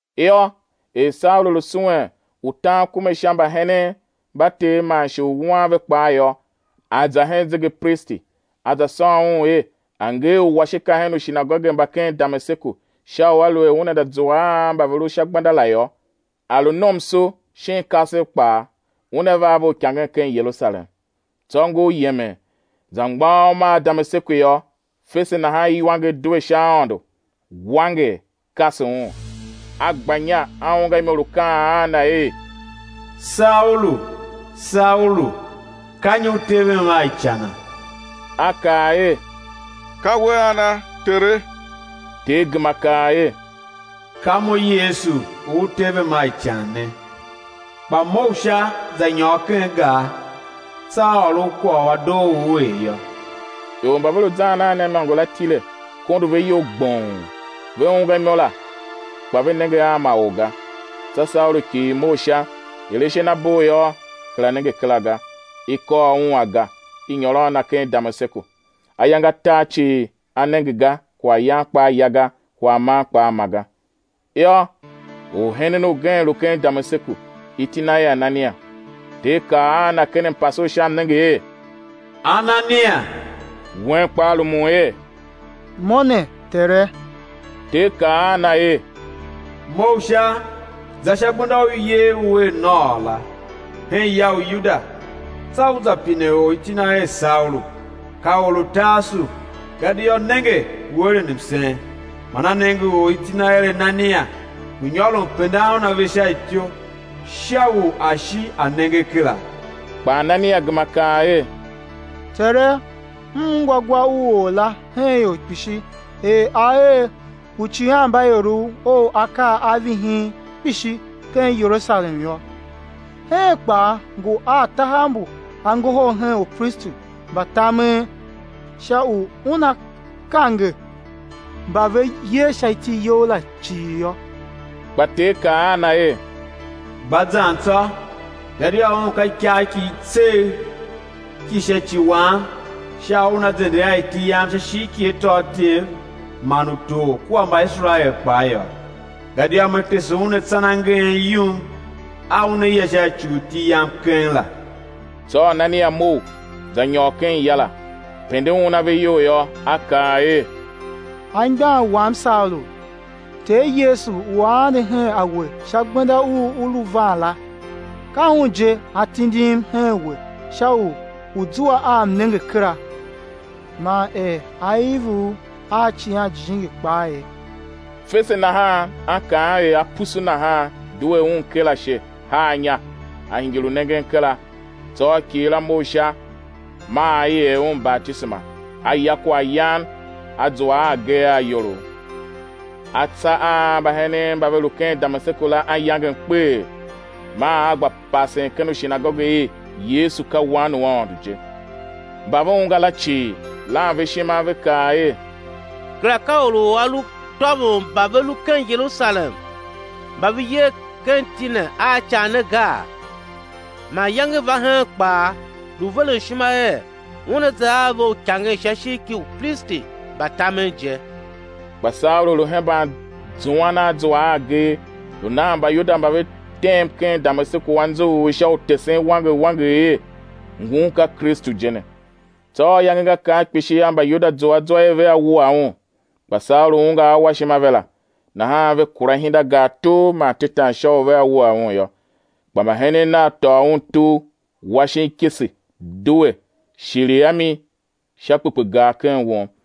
Yô, er Saulu lu suwen u tan kume sha mbahenen mba Ter man shi u wuan ve kpaa yô, a za hen zegepristi a za sôn un er a̱ nger uwashika hen ushinagoge mba ken Damaseku sha u aluer una za zua a mba ve lu sha gbenda la yô, a lu nomso shin kasev kpaa, una va a ve uikangen ken Yerusalem. Tsô ngur yemen, za mgbôghom a Damaseku yô, fese nahan iwanger due sha aôndo, wanger, kase un; a gba inya a ungwa imo lu kaan a na er: Saulu! Saulu! Ka nyi u tevem a icana? A kaa er: Ka We ana, Tere? Ter gema kaa er: Ka Mo, Yesu u u tevem a ican ne! Kpa mough sha, za nyôr ken gar, tsô á ôr u kwagh u a doo u ú er yô. Ior mba ve lu zan a na imôngo la tile, kondo ve iyol gbong, ve ungwa imo la, kpa ve nenge a ma or ga. Tsô Saulu kighir mough sha; er ashe na bugh yô, kera nenge kera ga; i kôr un aga, i nyôr a na ken Damaseku. Ayange atar cii, a nenge ga, kwaghyan kpaa ya ga, kwaghman kpaa ma ga. Yô, orhenen ugen lu ken Damaseku, iti na er Anania. Ter kaa a na ken mpase u sha mnenge er: Anania! Wen kpaa rumun er: Mo ne, Tere. Ter kaa a na er: Mough sha, za sha gbenda u i yer u er Nôô la, hen ya u Yuda, tsô u za pine or iti na er Saulu, ka or u Tarsu, gadia nenge, ngu eren msen, man a nenge or, iti na er Anania, ngu nyôron pendan un ave sha ityou, sha u a shi a nenge kera. Kpa Anania gema kaa er: Tere, M ungwa gwa u or la hen ior kpishi, er a er uicighanmbaiorov Ou akaa a vihin kpishi ken Yerusalem yô. Heen kpaa ngu a tahav mbu a ngohol hen upristi mba tamen sha u una kange mba ve yer sha iti You la cii yô. Kpa Ter kaa a na er: Gba zan tsô, gadia un ka ikagh ki i tsegh ki sha ci Wam sha u una zende a iti Yam sha ishigh ki atôatyev man utor kua Mbaiserael kpaa yô. Gadia Me tese un atsan a ngeen yum a una ya a sha ci u iti Yam keng la. Tsô Anania mough, za nyôr ken ya la. Pende un ave iyol yô, a kaa er: Anmgbian wam Saulu, Ter Yesu u A ande her a we sha gbenda u u lu van la, ka Un je A tindim hen we sha u ú zua a mnenge kera, man er á iv u a Icighan Jijingi kpaa ye. Fese nahan ankaam er apusu nahan, due un ker ashe, haa inya; a hingir u nengen kera. Tsô a kighir a mough sha, maa i er un batisema. A ya kwaghyan a zua a agee a iyolough. A tsa a mbahenen mba ve lu ken Damaseku la anyangem kpeghee, maa a gba pasen ken ushinagoge er Yesu ka Wan u Aôndo je. Mba ve ungwa la cii, lan ve ishima, ve kaa er: Kera ka or u a lu tôvon mba ve lu ken Yerusalem mba ve yer ken iti ne a ican ne gaa? Man iyange va heen kpaa, lu veren ishima er una za a ve uikangen sha ishigh ki upristi mba tamen je. Kpa Saulu lu hemban zuan a zua a agee, lu nan Mbayuda mba ve tem ken Damaseku anzughul sha u tesen wanger wanger er: Ngun ka Kristu je ne. Tsô ayange nga kar kpishi yô, Mbayuda zua zwa er vea wua un. Kpa Saulu ungwa awashima ve la; nahan ve kura ihindagar tugh man tetan sha u vea wua un yô. Kpa mbahenen nav tôô un tugh, wa shin ikese, due, shiligh a mi sha kpekpegar ken won.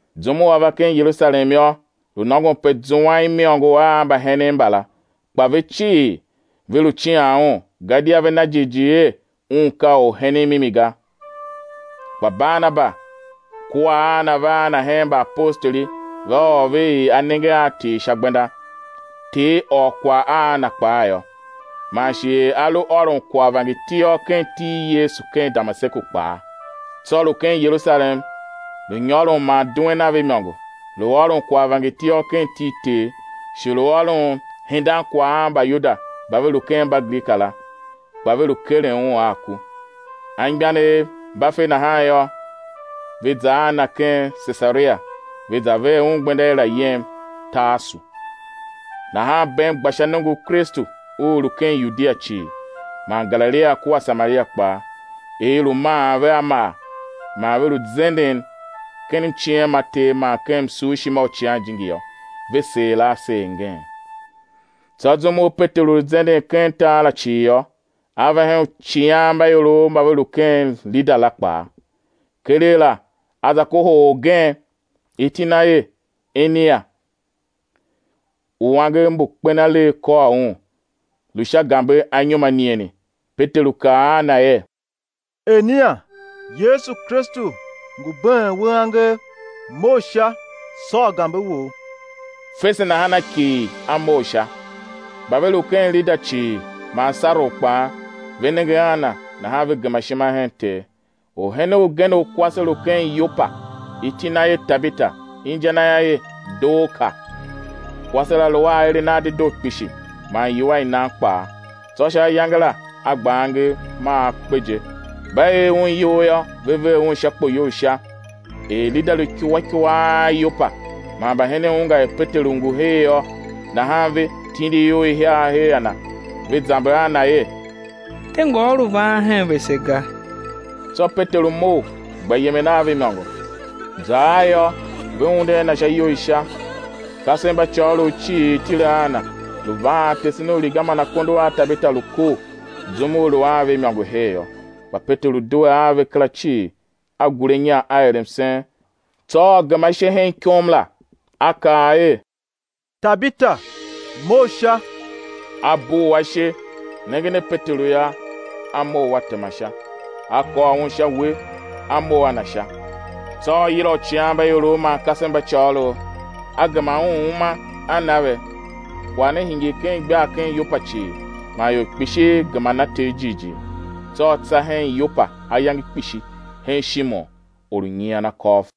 Zum u a va ken Yerusalem yô, lu nôngon pe zuan imôngo a mbahenen mbala; kpa ve cii, ve lu cian un, gadia ve na jighjigh er un ka orhenen mimi ga. Kpa Barnaba kua a na va a na hen mbaapostoli, va ôr ve er a nenge a Ter sha gbenda, Ter ôr kwagh a na kpaa yô, man shi er a lu ôron kwagh vangertiôr ken iti i Yesu ken Damaseku kpaa. Tsô lu ken Yerusalem lu nyôron man duen a ve imôngo; lu ôron kwagh vangertiôr ken iti i Ter, shi lu ôron hendan kwagh a Mbayuda mba ve lu ken Mbagrika la; kpa ve lu keren un a ku. Anmgbianev mba fe nahan yô, ve za a na ken Sesaria, ve za ver un gbenda er, a̱ yem Tarsu. Nahan bem gba sha nongo u Kristu u u lu ken Yudia cii, man Galilia kua Samaria kpaa; er i lu maan ve a maa, man ve lu zenden ken mciem ma Ter man ken msurshima u Icighan Jijingi yô, ve seer a seer ngeen. Tsô zum u Peteru lu zenden ken tar la cii yô, a va hen uicighanmbaiorov mba ve lu ken Lida la kpaa. Keregh la a za kohol orgen, iti na er Enia, u angev mbu kpen alegh kôr un, lu sha gambe anyom anigheni. Peteru kaa a na er: Enia, Yesu Kristu ngu been we angev, mough sha, sôr gambe wou. Fese nahan a kighir, a mough sha. Mba ve lu ken Lida cii man Saron kpaa, ve nenge a na, nahan ve gema ishima hen Ter. Orhenen ugen u kwase lu ken Yopa, iti na er Tabita, inja na yô, er Dorka. Kwase la lu a aeren a dedoo kpishi, man iwua i nan kpaa. Tsô sha ayange la a gba angev, maa a kpe je; mba ee un iyol yô, ve ver un sha kpoyou u sha. Er Lida lu ikua ikua a Yopa man mbahenen ungwa er Peteru ngu her yô, nahan ve tindi ior ihiar her a na, ve za zamber a na er: De ngôôr u van hen vese ga. Tsô Peteru mough, gba yemen a ve imôngo. Za ar yô, ve unde a na sha iyou i sha. Kasev mba côgholov cii tile a na, lu vaan tesen uriga man akondo a Tabita lu kor, zum u lu a ve imôngo her yô. Kpa Peteru due a ve kera cii, a gure inya, a er msen; tsô a gema ashe hen ikom la, a kaa er: Tabita, mough sha! A bugh ashe; nengen a Peteru yô, a mough, a tema sha. A kôr un sha uwe, a mough a na sha. Tsô a yila uicighanmbaiorov man kasev mba côgholov, a gema un uma a na ve. Kwagh ne hingir ken igbar ken Yopa cii; man ior kpishi gema na Ter jighjigh. Tsô a tsa hen Yopa ayange kpishi hen Shimon, or u nyian akôv.